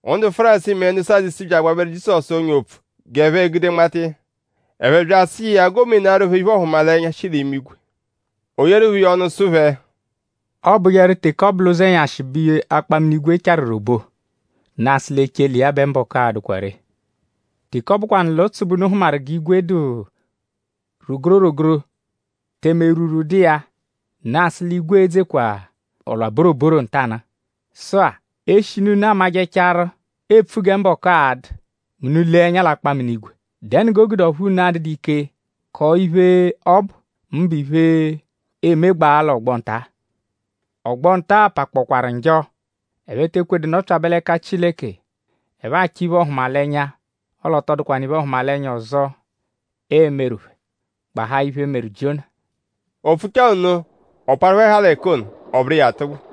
Ndu Fárisii mẹ ndu Sadusii bya agbabẹru Jizọsu ọ́nyà opfu g'ẹphe gude nmata iya. Ẹphe bya asụ iya g'o menaarụ phẹ iphe-ọhumalenya, shi l'imigwe. O yeeru phẹ iya ọnu sụ phẹ: “Ọobujeru teke ọ bụ l'ụzenyashi bẹ akpaminigwe charu roboo; unu asụ l'echele iya bẹ mbọku a-dụkwaa ree. Teke ọ bụkwanu l'ụtsu bẹ unu hụmaru g'igwe dụ rogoro rogoro; tẹme erwurwu dụ iya; unu asụ l'igwe e-dzekwa ọ-lwa-boroboro ntanụ-a. Sụ-a; eshinu unu amajẹchaaru epfu gẹ mbọku a-dụ mẹ unu -lee ẹnya l'akpaminigwe;?dẹnu g'o gude ọphu unu adụdu ike kọo iphe, ọ bụ; mbụ iphe, emegbaa l'ọgbo nta-a? Ọgbo nta-a pakpọkwaru njọ. Ẹphe te ekwedu nọpyabe l'ẹka Chileke. Ẹphe achọ iphe-ọhumalenya; ọle ọ tọ dụkwanu iphe-ọhumalenya ọzo, eemeru phẹ; gbahaa iphe, meru Jiona.” O pfuchaa nno; ọ parụ phẹ haa l'ẹka ono; ọ bụru iya atụgbu.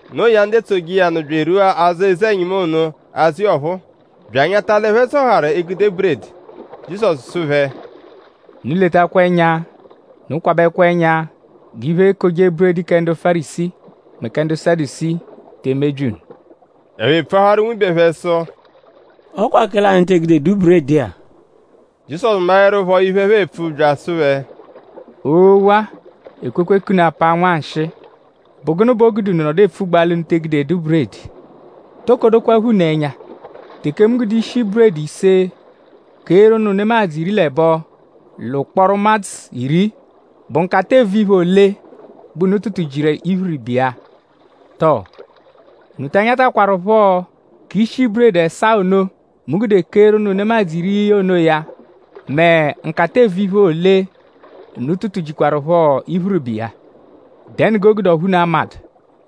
No iya; ndu etsoje iya nụ bya erwua azụ eze-ẹnyimu ono azụ iya ọphuu bya anyata l'ẹphe zọharu egude buredi. Jizọsu sụ phẹ: “Unu letakwa ẹnya; unu kwabẹkwa ẹnya g'iphe-ekoje-buredi kẹ ndu Fárisii mẹ kẹ ndu Sadusii te emebyi unu.” Ẹphe pfuaharu nwibe phẹ sụ: “Ọ kwa kẹle anyi te egudedu buredi-a.” Jizọsu maẹrupho iphe, ẹphe epfu bya asụ phẹ: “Oo-wa! Ekwekwe k'unu apaa nwanshịi!?Bụ gụnu bẹ o gude unu nọdu epfugbaa l'unu te egudedu buredi? ?Toko dokwaphọ unu ẹnya? Teke mu gude ishi buredi ise keeru ụnu nemadzụ iri l'ẹbo l'ụkporo ụmadzu iri;?bụ nkata-eevu-iphe ole bẹ unu tụtu-jiru l'iphiriba iya? Tọo?unu ta anyatakwarụpho k'ishi buredi ẹsaa ono, mu gude keeru ụnu nemadzụ iri onoya??mẹ nkata-eevu-iphe ole, unu tụtu-jikwaruphọ l'iphiriba iya? ?Dẹnu g'o gude ọphu unu amadụ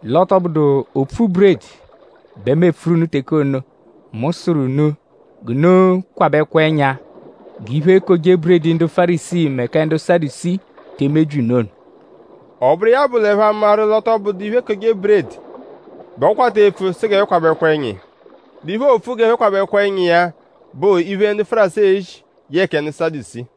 l'ọ tọ bụdu opfu buredi bẹ mu epfuru unu teke ono, mu sụru unu g'unu kwabẹkwa ẹnya g'iphe-ekoje-buredi ndu Fárisii mẹ kẹ ndu Sadusii te emebyi unu ono?” Ọ bụru iya bụ l'ẹphe amaru l'ọ tọ bụdu iphe-ekoje-buredi bẹ ọ kwata epfu sụ g'ẹphe kwabẹkwa ẹnya iya; l'iphe, oopfu g'ẹphe kwabẹkwa ẹnya iya bụ iphe, ndu Fárisii ezi yẹe kẹ ndu Sadusii.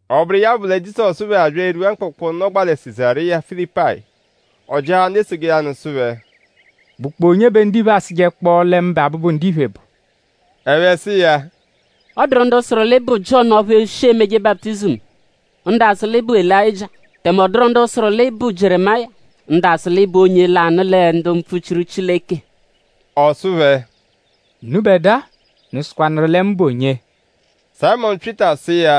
Ọ bụru iya bụ lẹ Jizọsu phẹ abya erwua mkpụkpu, nọgbaa lẹ Sizariya Filipayi. Ọ jịahaa ndu etsoje iya nụ sụ phẹ: “?Bụkpoo onye bẹ ndiphe asụjekpoo lẹ mụbe Abụbu-Ndiphe bụ?” Ẹphe sụ iya: “Ọ dụru ndu sụru l'ị bụ Jiọnu ọphu shi emeje baputizimu; ndu asụ l'ị bụ Elayịjia; tẹme ọ dụru ndu sụru l'ị bụ Jieremaya; ndu sụ l'ị bụ onye lanụ lẹ ndu mpfuchiru Chileke.” Ọ sụ phẹ: “Unubẹdua;?unu sụkwanuru lẹ mu bụ onye?” Sayịmonu Pyịta sụ iya: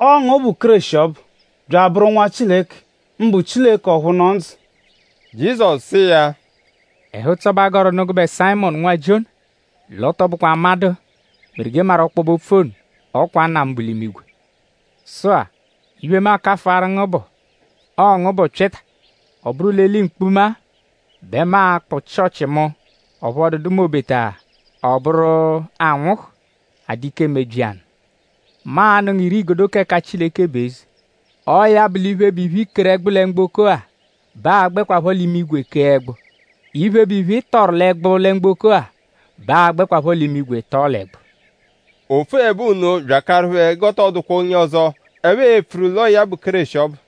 “Ọo ngu bụ Kéreshi ọbu, bya abụru Nwa Chileke; mbụ Chileke ọphu nọ ndzụ.” Jizọsu sụ iya: “Ẹhu-ụtso bẹ a gọru nụ gụbe Sayịmonu nwa Jiona! L'ọ tọ bụkwa amadụ meru g'ị maru ọkpobe-opfu ono. Ọ kwa Nna mu, bu l'imigwe. Sụ-a; iphe, mu akafụaru ngu bụ; ọo ngu bụ Pyịta. Ọ bụru l'eli mkpuma-a bẹ mu a-kpụ Chịochi mu. Ọphu ọ dụdu m'obeta ọ bụru anwụhu a-dụ ike emebyi ya nụ. Mu a-nụ ngu ire-igodo k'ẹka Chileke bụ eze. Ọo ya bụ; iphe, bụ iphe, i keru ẹgbu lẹ mgboko-a bẹ a gbẹakwaa l'imigwe kee ẹgbu. Iphe, bụ iphe, ị tọru l'ẹgbu lẹ mgboko-a bẹ a gbẹakwaa l'imigwe tọo l'ẹgbu.” O pfuẹbe nno bya akaru phẹ g'ọ tọ dụkwa onye ọzo, ẹphe e-pfuru l'ọo ya bụ Kéreshi ọbu.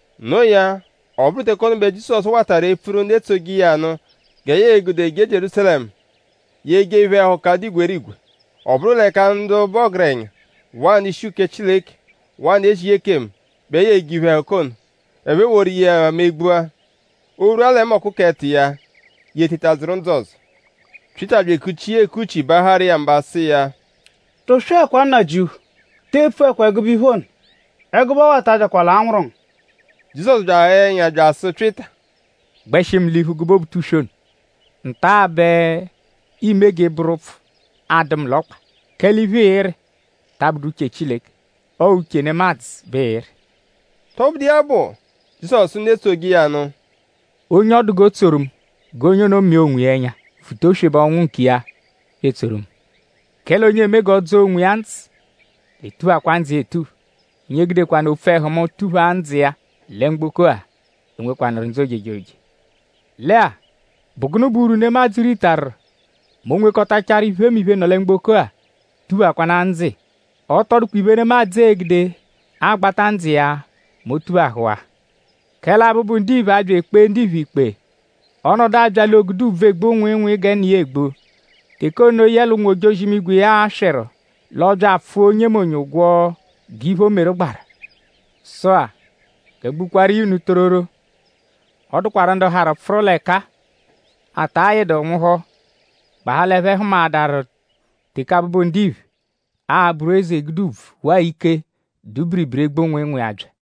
No iya; ọ bụru teke ono bẹ Jizọsu watarụ epfuru ndu etsoje iya nụ gẹ ya e-gude jee Jierúsalẹmu; ya ejee iphe-ẹhuka, dụ igwerigwe. Ọ bụru l'ẹka ndu bụ ọgerenya; waa ndu-ishi uke Chileke; waa ndu ezije ekemu bẹ ya e-je iphe-ẹhuka ono. Ẹphe eworu iya megbua. O -rwua lẹ mbọku k'ẹto iya; ya eteta dzụru ndzụ ọzo. Pyịta bya ekuchi iya ekuchi baaharụ iya mba sụ iya: “Tụswekwa Nnajịuphu! Te epfuẹkwa ẹgube ono! Ẹgube ọwa-a ta abyakwa l'anwụru ngu!” Jizọsu bya aghaa ẹnya bya asụ Pyịta: “Gbẹshi mu l'iphu gụbe Obutuswe ono. Nta-a bẹ iime g'ị bụru ụpfu adụ mu l'ọkpa; kẹle iphe, ịiri ta abụdu uche Chileke; ọo uche nemadzụ bẹ ịiri.” Tọbudu iya bụ; Jizọsu sụ ndu etsoje iya nụ: “Onye ọ dụ g'o tsoru mu g'onye ono mịa onwiya ẹnya; vuta oswebe ọnwu nkiya bya etsoru mu. Kẹle onye eme g'ọ dzọo onwiya ndzụ l'e-tuphakwa ndzụ iya etupha. Onye gudekwanụ opfu ẹhu mu tuphaa ndzụ iya lẹ mgboko-a e-nwekwanụru ndzụ ojejoje. Lẹ-a;?bụ gụnu bụ urwu, nemadzụ ritaru mẹ o -nwekọtachaaru iphemiphe, nọ lẹ mgboko-a; tuphakwanaa ndzụ iya? Ọ tọ dụkwa iphe, nemadzụ egude agbata ndzụ iya mẹ o -tuphahụwaa. Kẹle Abụbu-Ndiphe a-bya ekpee ndiphe ikpe. Ọ -nọdu abya l'oogude ùbvù, egbu nwịinwii gẹ Nna iya egbu. Teke ono yẹle ụnwu-ojozi-imigwe iya aswịru; l'ọo-bya apfụa onyemonye ụgwo g'iphe, o meru gbaru. Sụ-a; gẹ mu gbukwaaru iya unu tororo; ọ dụkwaru ndu harụ pfụru l'ẹka-a, ata yịdu nwụhu; gbahaa l'ẹphe hụmaadaru teke Abụbu-Ndiphe a-bụru eze; gude ùbvù; waa ike, dụ biribiri egbu nwịinwii abya.”